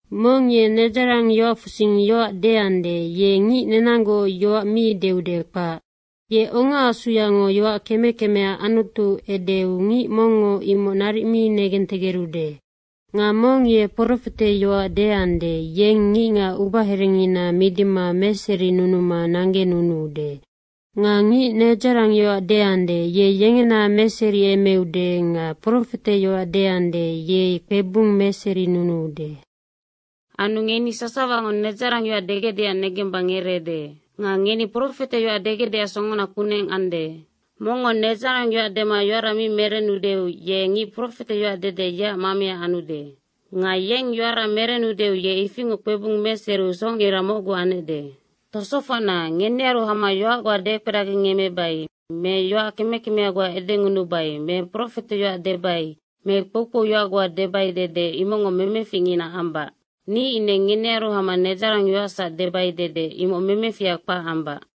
Mong ye nedzarangyoacfusing yoac deande, ye ngic nenanggoc yoac mi deude, kpac. Ye ongaasuyango yoac keme kemea Anutu edeu, ngic mongngo imoc naric mi negentegerude. Nga mong ye profeteyoac deande, yeng ngicngac ubaherengina midima meserinunuma nanggenunuude. Nga ngic nedzarangyoac deande, ye yengena meseriemeude nga profeteyoac deande, yeng kpebung meserinunuude. Anu ngeni sasawango nedzarangyoac degecdeac negemba ngereede. Nga ngeni profeteyoac degecdeac songona kuneng ande. Mongngo nedzarangyoac dema yoara mi merenudeu ye ngic profeteyoac dede, yeac mamea anude. Nga yeng yoara merenudeu ye ifingoc kpebung meseriu socngira mocgu anecde. Tosofocna, ngenearu hama yoac goa dekperagingemmebai me yoac keme kemea goa edengunubai me profeteyoac debai me kpoukpouyoac goa debai dede imocngo memeficngina ambac. Ni ine ngenearu hama nedzarangyoacsac debai dede, imoc memefiha kpac ambac.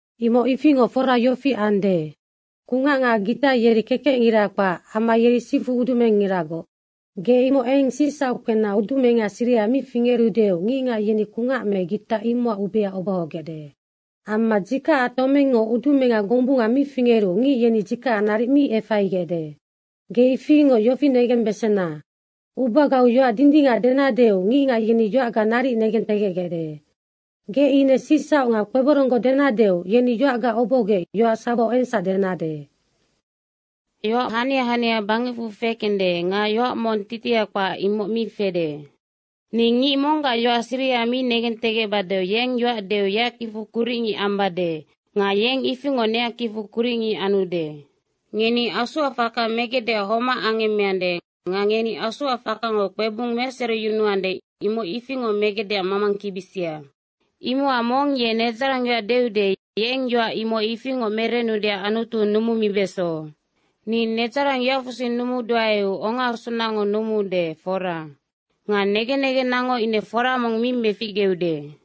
Imoc ifingoc fora yofi ande. Kungac nga gita yeri kekecngira kpac amma yeri sifu udumengngiragoc. Ge imoc eng sicsauc kpena udumenga siriha mi fingerudeu ngicngac yeni kungac me gita imocac ubea obohogecde. Amma dzikacac tomengngo udumenga gombunga mi fingeru ngic yeni dzikacac naric mi efaigecde. Ge ifingoc yofi negembesena, ubagau yoac dindingac denadeu ngicngac yeni yoacga naric negentegecgecde. Ge ine sicsauc nga kpeboronggoc denadeu yeni yoacga obohogec yoac sawau engsac denade. Yoac hania hania bangecfu fekende nga yoac mong titiha kpac, imoc mi fede. Ni ngic monggac yoac siriha mi negentegecbadeu yeng yoac deu yeac kicfu kuricngic ambade nga yeng ifingoc neac kicfu kuricngic anude. Ngeni Asuac faka megecdeac homac angemmeande nga ngeni Asuac fakango kpebung meseriyunuande, imoc ifingoc megecdeac mamangkibisia. Imocac mong ye nedzarangyoac deude, yeng yoac imoc ifingoc merenudeac Anutu numumibeso. Ni nedzarangyoacfu sing numuduaeu ongaasunango numuude, fora. Nga negen negennango ine fora mong mi meficgeude.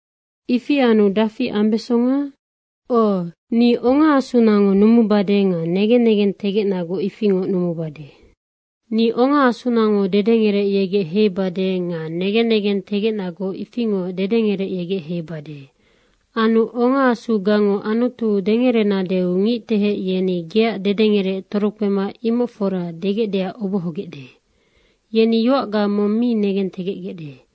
Ifi anu dafi ambesonga? O, ni ongaasunango numubade nga negen nengentegecnagoc ifingoc numubade. Ni ongaasunango dedengerec yegec heibade nga negen negentegecnagoc ifingoc dedengerec yegec heibade. Anu ongaasugango Anutu dengerenadeu ngictehec yeni geac dedengerec torokpema, “Imoc fora.” degecdeac obohogecde. Yeni yoacga mong mi negentegecgec.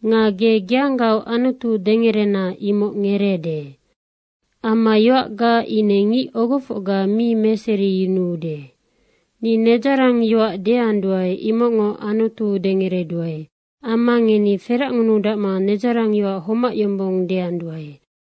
Nga ge geanggaoc Anutu dengerena imoc ngereede. Amma yoacga ine ngic ogofocga mi meseriyunuude. Ni nedzarangyoac deanduae, imocngo Anutu dengereduae. Amma ngeni feracngunudacma nedzarangyoac homac yombong deanduae.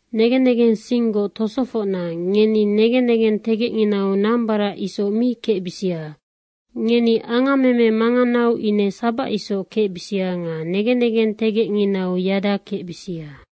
Negen negensinggoc tosofocna, ngeni negen negentegecnginau nambarac isoc mi kecbisia. Ngeni angammeme manganau ine sabac isoc kecbisia nga negen negentegecnginau yada kecbisia.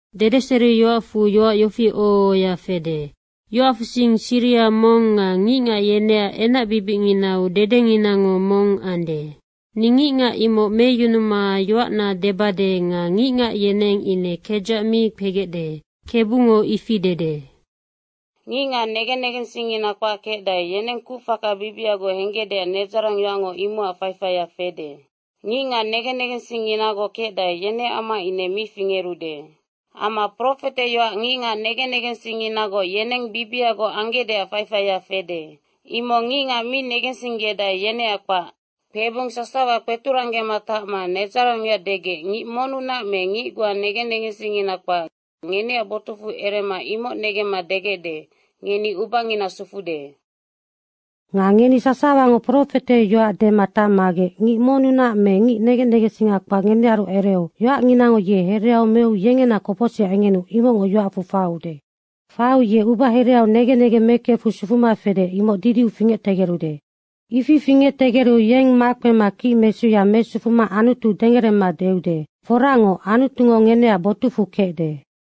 Dedeseriyoacfu yoac yofi oho ohoya fede, “Yoacfusing siriha mong nga ngicngac yeneac enacbibicnginau dedenginango mong ande, ni ngicngac imoc meyunuma yoacna debade nga ngicngac yeneng ine kedzac mi kpegecde, KEBUNGO ifi dede.” Ngicngac negen negensingngina kpac kecdae, yeneng kucfaka bibiagoc henggecdeac nedzarangyoacngo imocac faifaia fede. Ngicngac negen negensingnginagoc kecdae, yeneac amma ine mi fingerude. Amma profeteyoac ngicngac negen negensingnginagoc yeneng bibiagoc anggecdeac faifaia fede. Imoc ngicngac mi negensinggedae, yeneac kpac. Kpebung sasawa kpeturanggema tacma nedzarangyoac degec ngic monnunac me ngic goa negen negensingngina kpac ngeneac botucfu erema imoc ngenemma degecde, “Ngeni ubangina sufude.” Nga ngeni sasawango profeteyoac dema tacmagec ngic monnunac me ngic negen negensinga kpac ngenearu ereu yoacnginango ye hereau meu yengena kopocsiha engenu imocngo yoacfu faiude. Faiu ye ubahereau negen negeng mekefu sufuma fede, imoc didiu fingectegerude. Ifi fingectegeru yeng makpema kicmesuya mesufuma Anutu dengerema deude, “Foracngoc, Anutungo ngeneac botucfu kecde.”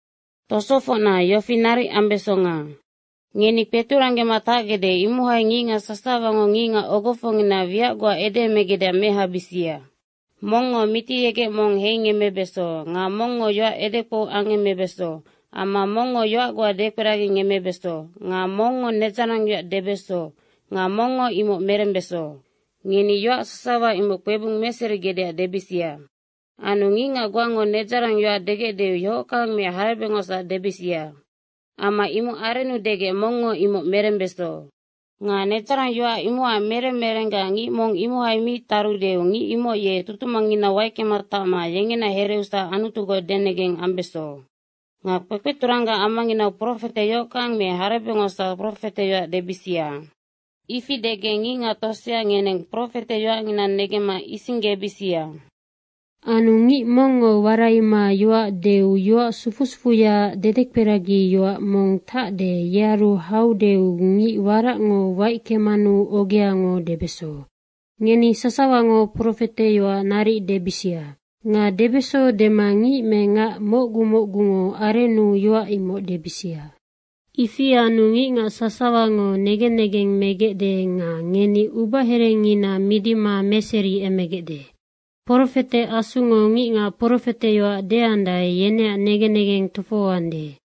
Tosofocna, yofi naric ambesonga. Ngeni kpeturanggema tacgecde, imohai ngicngac sasawango ngicngac ogofocngina wiac goa edeemegecdeac mehabisia. Mongngo mitiyegec mong heingemmebeso nga mongngo yoac edekpou angemmebeso amma mongngo yoac goa dekperagingemmebeso nga mongngo nedzarangyoac debeso nga mongngo imoc merembeso. Ngeni yoac sasawa imoc kpebung meserigecdeac debisia. Anu ngicngac goango nedzarangyoac degecdeu yohockang me harebecngosac debisia. Amma imoc arennu degec mongngo imoc merembeso. Nga nedzarangyoac imocac merem merenggac ngic mong imohai mi tarudeu ngic imoc ye tutumangnginau waickema tacma yengena hereusac Anutugoc denegeng ambeso. Nga kpekpeturanggac amanginau profete yohockang me harebecngosac profeteyoac debisia. Ifi degec ngicngac tosea ngeneng profeteyoacngina negemma isinggebisia. Anu ngic mongngo waraima yoac deu yoac sufu sufuyaac dedekperagiyoac mong tacde yearu haudeu ngic waracngo waickemanu ogeango debeso. Ngeni sasawango profete yoac naric debisia. Nga debeso dema ngic me ngac mocgu mocgungo arennu yoac imoc debisia. Ifi anu ngicngac sasawango negen negeng megecde nga ngeni ubaherengina midima meseriemegecde. Profete asungo ngicngac profeteyoac deandae yeneac negen negeng tofohoande.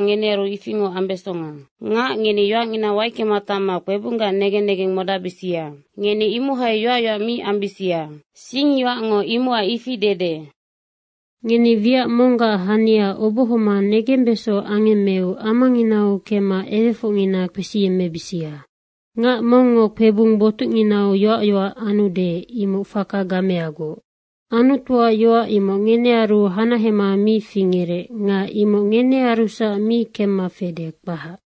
ngenearu ifingoc ambesonga. Ngac ngeni yoacngina waickema tacma kpebunggac negen negeng modacbisia. Ngeni imohai yoac yoac mi ambisia. Singyoacngo imocac ifi dede. Ngeni wiac monggac hania obohoma negembeso angemmeu amanginau kemma ewefocngina kpesiyemmebisia. Ngac mongngo kpebung botucnginau yoac yoac anude, imoc faka gameagoc. Anutuac yoac imoc ngenearunac hanahema mi fingerec nga imoc ngenearusac mi kemma fede, kpac.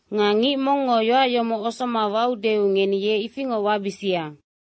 Nga ngic mongngo yoac yomoc osoma waudeu ngeni ye ifingoc wabisia.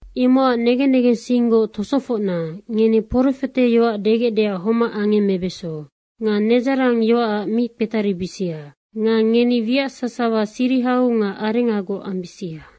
Imocac negen negensinggoc tosofocna, ngeni profeteyoac degecdeac homac angemmebeso. Nga nedzarangyoacac mi kpetaribisia. Nga ngeni wiac sasawa sirihau nga arengagoc ambisia.